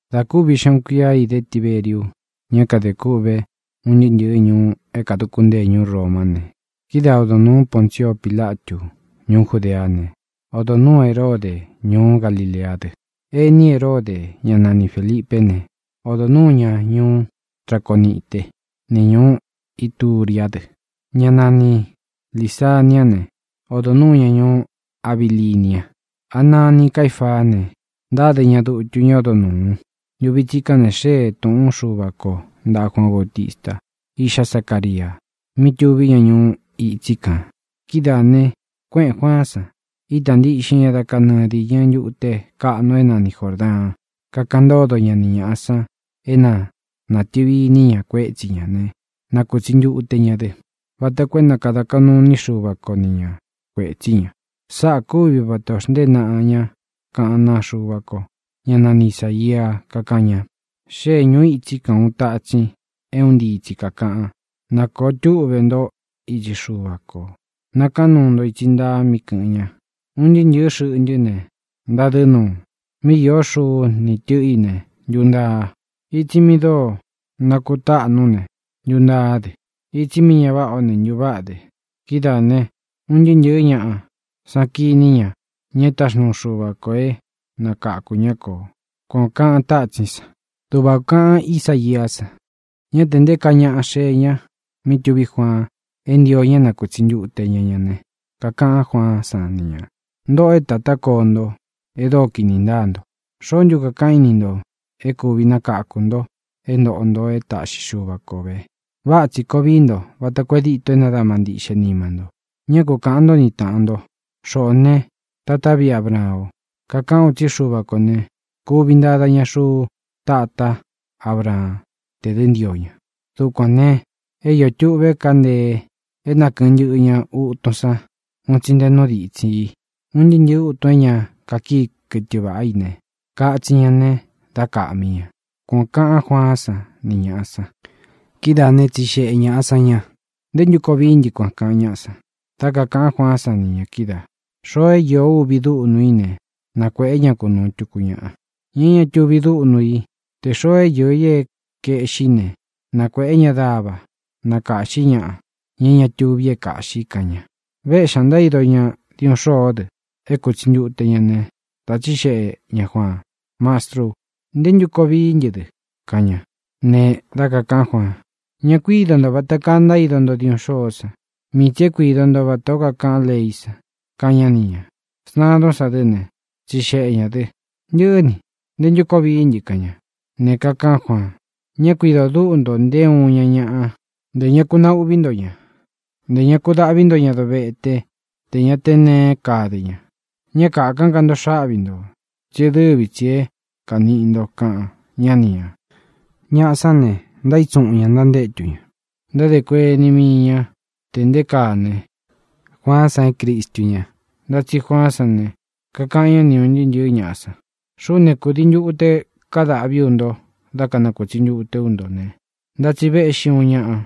Dā kúvi xeꞌun kuia é īdé Tiberiu ña é kadē kûꞌve un ntɨɨ́ ntɨ̄ɨ ñuú é kāduku ntée Romá ne, kidáa odo nūu Poncio Pílatu ñuú Judeá ne, odo nūu Heródē ñuú Galileá dɨ. Ení Heródē, ñá nani Fēlipé ne, odo nuū ñá ñuú Traconite ni ñūú Ituriá dɨ. Ña nani Līsaniá ne, odo nuū ñá ñuú Abilinia. Anaa ni Caífaa ne, ntáde ña dutu ñá odo nūu. Ntuvi tsikán ne, xée tūꞌún Xuva kō ntaꞌa Juaan Bautista, iꞌxá Zacaria, mí tuví ña ñuu itsí kān. Kidáā ne, kuéꞌēn Juaán san, ita ntíꞌxin ña dá kanɨɨ dīñɨ ntute kaꞌnu é nani Jōrdaan, kakaꞌan ntódo ña ni ñāꞌa san é na nātɨvi iní ña kuétsi ña ne, na kūtsi ntute ña dɨ, vata koo é na kāda kaꞌnu iní Xuva ko ni ña kuētsí ña. Sáꞌā kúvi vata ō xnteé naꞌa ña kaꞌán naa Xuva ko, ñá nani Isāia, kakáꞌan ña: Xée ñūu îtsí kān uun tatsin é un ntii tsi kākaꞌan: “Nākoo túꞌve ntó itsi Xuva kō; nakaán nuu nto itsi ntaa mí kɨ̄ꞌɨn ña. Un ntɨɨ́ ntɨ̄ɨ́ xɨꞌntɨ́ ne, ntadɨ́ nuu. Míꞌi īó xuku ni tɨꞌɨ̄ í ne, ntuntaa. Itsi mi dóo nakutáꞌnu ne, ntuntaá dɨ. Itsi mí ña váꞌā o ne, ntuváꞌa dɨ. Kidáā ne, un ntɨɨ́ ntɨ̄ɨ́ ñaꞌa san kiní ña ña é taxnúu Xuva kō é nakakū ñá kō”, kuan ō kaꞌan tatsín san. Duꞌva ō kaꞌan Isáiá san. Ñá tē nté kaa ñaꞌa xée ña mí tuví Juaan é ntio ña é nakūtsi ntute ña ña ne, kakaꞌan Juaán san ni ñā: —¡Ntōꞌo é tatá koo nto e dóo kīni ntáa nto! ¿Xóo ntu kakāꞌán i ni ntō é kūvi nakáku nto é ntōꞌo nto é taꞌxi Xuva kō ve? Váꞌa tsī koo vií nto vata koo e díto é nadama ntiꞌxe nima nto. Ñá ku kaꞌān ntó ni tāꞌan nto: “Xoꞌō né, tatá viꞌi Abraan o”. Kakaꞌán u tsí Xuva kō ne, kuvi ntada ña xuu tatá Abraán tē dɨ́ ntio ña. Dukuān ne, é iō tuꞌve káa ntee é nakɨ̄ɨn ntɨꞌɨ ña utun sán un tsi nte nú ditsin i. Un ntɨɨ́ ntɨ̄ɨ́ utun é ña kakíi kɨtɨ vāꞌá i ne, katsin ña ne, dá kāꞌmí ña —kuān o kaꞌán Juaán san ni ñāꞌa san. Kidáā né, tsixeꞌe ñāꞌa san ña: —¿Ntē ntú koo vií ntɨ kuan? —kaꞌan ñáꞌa san. Dá kakāꞌan Juaán san ni ñā kídaā: —Xoo é īó uvi duꞌnu i ne, na kuēꞌé ña kunūu tuku ñaꞌa, ña é ña tuvi dúꞌnu i. Tē xoo é īo é kaeꞌxí i ne, na kuēꞌé ña dava na kāꞌxí ñaꞌa, ña é ña tuvi é kāꞌxi —kaꞌan ña. Véꞌxī ña ntaído diuꞌun xôó dɨ é kūtsi ntute ña ne, dā tsíxeꞌe ñā Juaan: —Mastrú, ¿ntē ntú koo vií ntɨ dɨ? —kaꞌan ña. Ne, dá kakāꞌán Juaan: —Ña kuído nto vata kaa ntaído nto diuꞌun xôó san; mii tsī é kuido nto vatā ó kakaꞌan leí san —kaꞌan ñá ni ñā. Sntadún san dɨ́ ne, tsixeꞌe ñā dɨ: —Ntɨꞌɨ́ ni, ¿ntē ntú koo vií ntɨ? —kaꞌan ña. Ne, kakaꞌán Juaan: —Ña kuído dúꞌu nto nté uun iña ñaꞌa; ntē ña ku nauꞌví nto ña. Ntē ña ku daꞌví nto ña dovete tē ña te neé kade ña. Ñá kākán ka nto xáꞌvi nto, tsí e dɨ́vi tsī é kaniꞌi nto —kaꞌan ñá ni ñā. Ñaꞌa sán ne, ntaítsuꞌun ñā ntantétu ña. Ntádē kuení mii ña tē nté kaa ne, Juaán san é Cristu ña. Ntá tsi Juaán san ne, kakaꞌan ñá ni ūn ntɨɨ́ ntɨ̄ɨ́ ñaꞌa san: —Xuꞌú ne, kūdii ntute kadáꞌvi ú nto da kanakūtsi ntute ú nto ne, ntá tsi véꞌxi ūun ñaꞌa,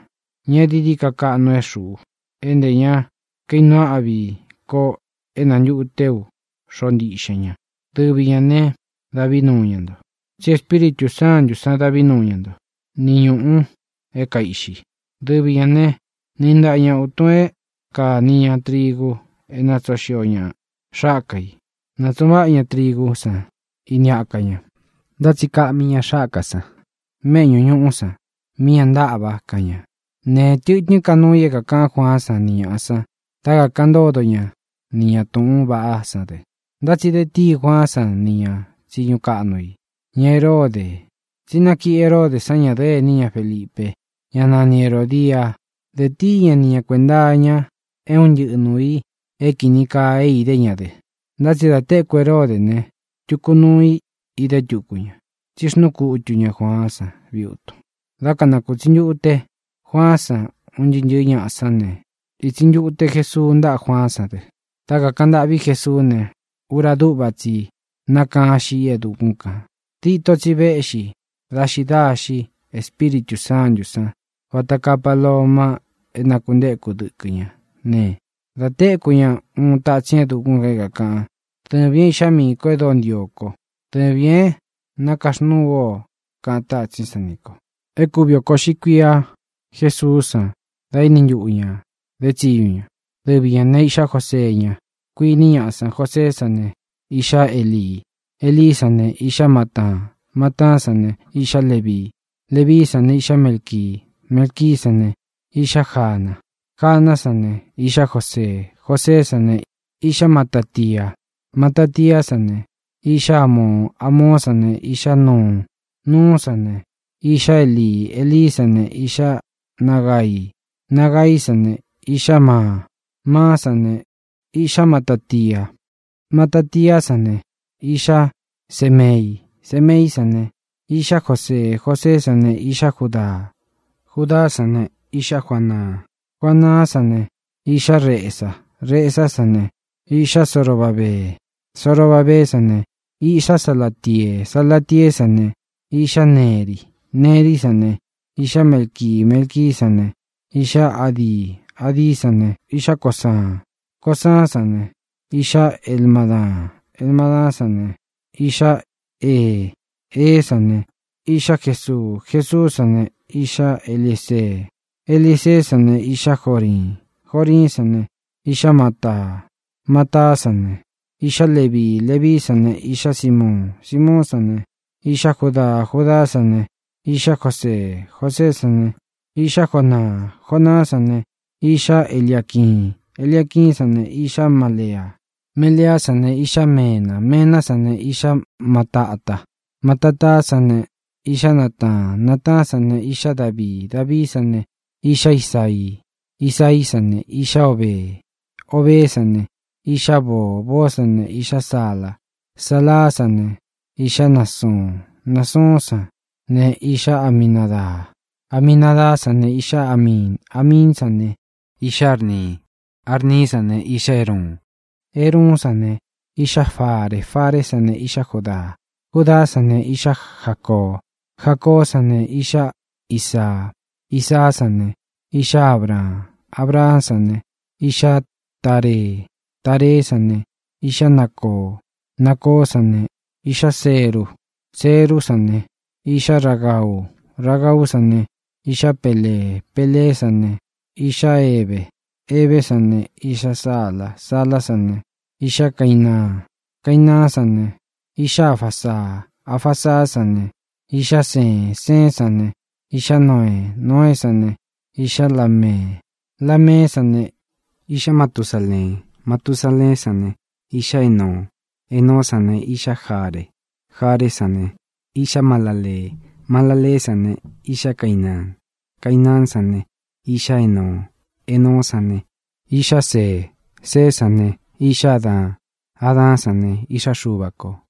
ña e dií dií ka kaꞌnu é xuꞌu, é ntē ña kainuu áꞌvi ko é nantúte ú xoꞌo ntiꞌxen ña. Dɨvi ñā ne, ñá tē ntúte dāꞌvi ñá nto, tsí Espíritū Sántu sán dāꞌví nuu ña nto, ni ñūꞌu é kaiꞌxi. Dɨvi ñā né, niꞌi ntaꞌa ña ūtun é kāni ña trigu é nātsoo xio ña xáka i. Nātsuꞌun váꞌa ña trigú san ini aka ña, ntá tsi kaꞌmi ña xáka san méꞌñu ñūꞌú san mí ña ntáꞌva —kaꞌan ña. Ne, tɨtɨ́n ka nuu i é kākaꞌán Juaán san ni ñāꞌa san dá kakaꞌan ntódo ña ni ñā túꞌūn vaꞌá san dɨ. Ntá tsi de tíi Juaán san nī ña tsiñu kaꞌnu i, ña Heródē, tsi nákiꞌi Heródē san ñadɨ́ꞌɨ ení ña Felipe, ñá nani Herōdia. Dē tíi ña ni ñā kuenta iña é un ntɨꞌɨ nuū i é kīni kaa é idé ña dɨ. Ntá tsi dā téku Heródē ne, tuku nuu i idé túku ña: tsí xnúu kutu ñā Juaán san viutun. Dá kanakūtsi ntute Juaán san un ntɨɨ́ ntɨ̄ɨ́ ñaꞌa sán ne, ītsi ntute Jesuu ntáꞌa Juaán san dɨ. Dá kakāꞌan ntâꞌví Jesuú ne, ura dúꞌva tsi nákaan xíꞌi e dukún kān. Dítō tsi véꞌxi daxi daxi Espíritū Sántū san vata kaa paloma é nākuntéku dɨkɨ ñá ne, dā téku ña uun tatsín e dukún kān é kākaꞌan: —Dɨvīn é iꞌxá miī kó e dóo ntio ko. Dɨvīn é nakaxnúu ú o —kaꞌan tátsín san ni ñā. É kūvi oko uꞌxi kuia Jésuú san da éni ntuꞌu ñā edé tsiñu ña. Dɨvi ñā né, iꞌxá Josee ña, kuíni ñaꞌa san. Joseé san ne, iꞌxá Elii. Elií san ne, iꞌxá Mataa. Mataá san ne, iꞌxá Levii. Levií san ne, iꞌxá Melqui. Melquí san ne, iꞌxá Jana. Janá san ne, iꞌxá Josee. Joseé san ne, iꞌxá Matatia. Matatiá san ne, iꞌxá Amoo. Amoó san ne, iꞌxá Nauun. Nauún san ne, iꞌxá Eli. Elí san ne, iꞌxá Nagai. Nagaí san ne, iꞌxá Maa. Maá san ne, iꞌxá Matatia. Matatiá san ne, iꞌxá Semei. Semeí san ne, iꞌxá Josee. Joseé san ne, iꞌxá Judaa. Judaá san ne, iꞌxá Juanaan. Juanaán san ne, iꞌxá Resa. Resá san ne, iꞌxá Zorobabee. Zorobabeé san ne, iꞌxá Salatiee. Salatieé san ne, iꞌxá Neri. Nerí san ne, iꞌxá Melqui. Melquí san ne, iꞌxá Adi. Adí san ne, iꞌxá Cosan. Cosán san ne, iꞌxá Elmadaan. Elmadaán san ne, iꞌxá Ee. Eé san ne, iꞌxá Jesuu. Jesuú san ne, iꞌxá Eliezee. Eliezeé san ne, iꞌxá Joriin. Joriín san ne, iꞌxá Mataa. Mataá san ne, iꞌxá Levii. Levií san ne, iꞌxá Simiuun. Simiuún san ne, iꞌxá Judaa. Judaá san ne, iꞌxá Josee. Joseé san ne, iꞌxá Jonaa. Jonaá san ne, iꞌxá Eliaquiin. Eliaquiín san ne, iꞌxá Melea. Meleá san ne, iꞌxá Mena. Mená san ne, iꞌxá Matata. Matatá san ne, iꞌxá Nataan. Nataán san ne, iꞌxá Davii. Davií san ne, iꞌxá Isaii. Isaií san ne, iꞌxá Obee. Obeé san ne, iꞌxá Boo. Boó san ne, iꞌxá Sala. Salá san ne, iꞌxá Nasuun. Nasuún san ne, iꞌxá Aminadaa. Aminadaá san ne, iꞌxá Amiin. Amiín san ne, iꞌxá Arni. Arní san ne, iꞌxá Eruun. Eruún san ne, iꞌxá Fare. Faré san ne, iꞌxá Judaa. Judaá san ne, iꞌxá Jacoo. Jacoó san ne, iꞌxá Isaa. Isaá san ne, iꞌxá Abraan. Abraán san ne, iꞌxá Taree. Tareé san ne, iꞌxá Nacoo. Nacoó san ne, iꞌxá Seruu. Seruú san ne, iꞌxá Ragau. Ragaú san ne, iꞌxá Pelee. Peleé san ne, iꞌxá Hebe. Hebé san ne, iꞌxá Sala. Salá san ne, iꞌxá Cainaan. Cainaán san ne, iꞌxá Afasaa. Afasaá san ne, iꞌxá Seen. Seén san ne, iꞌxá Noee. Noeé san ne, iꞌxá Lamee. Lameé san ne, iꞌxá Matusaleen. Matusaleén san ne, iꞌxá Enoo. Enoó san ne, iꞌxá Jaree. Jareé san ne, iꞌxá Malalee. Malaleé san ne, iꞌxá Cainaan. Cainaán san ne, iꞌxá Enoo. Enoó san ne, iꞌxá See. Seé san ne, iꞌxá Adaan. Adaán san ne, iꞌxá Xuva kō.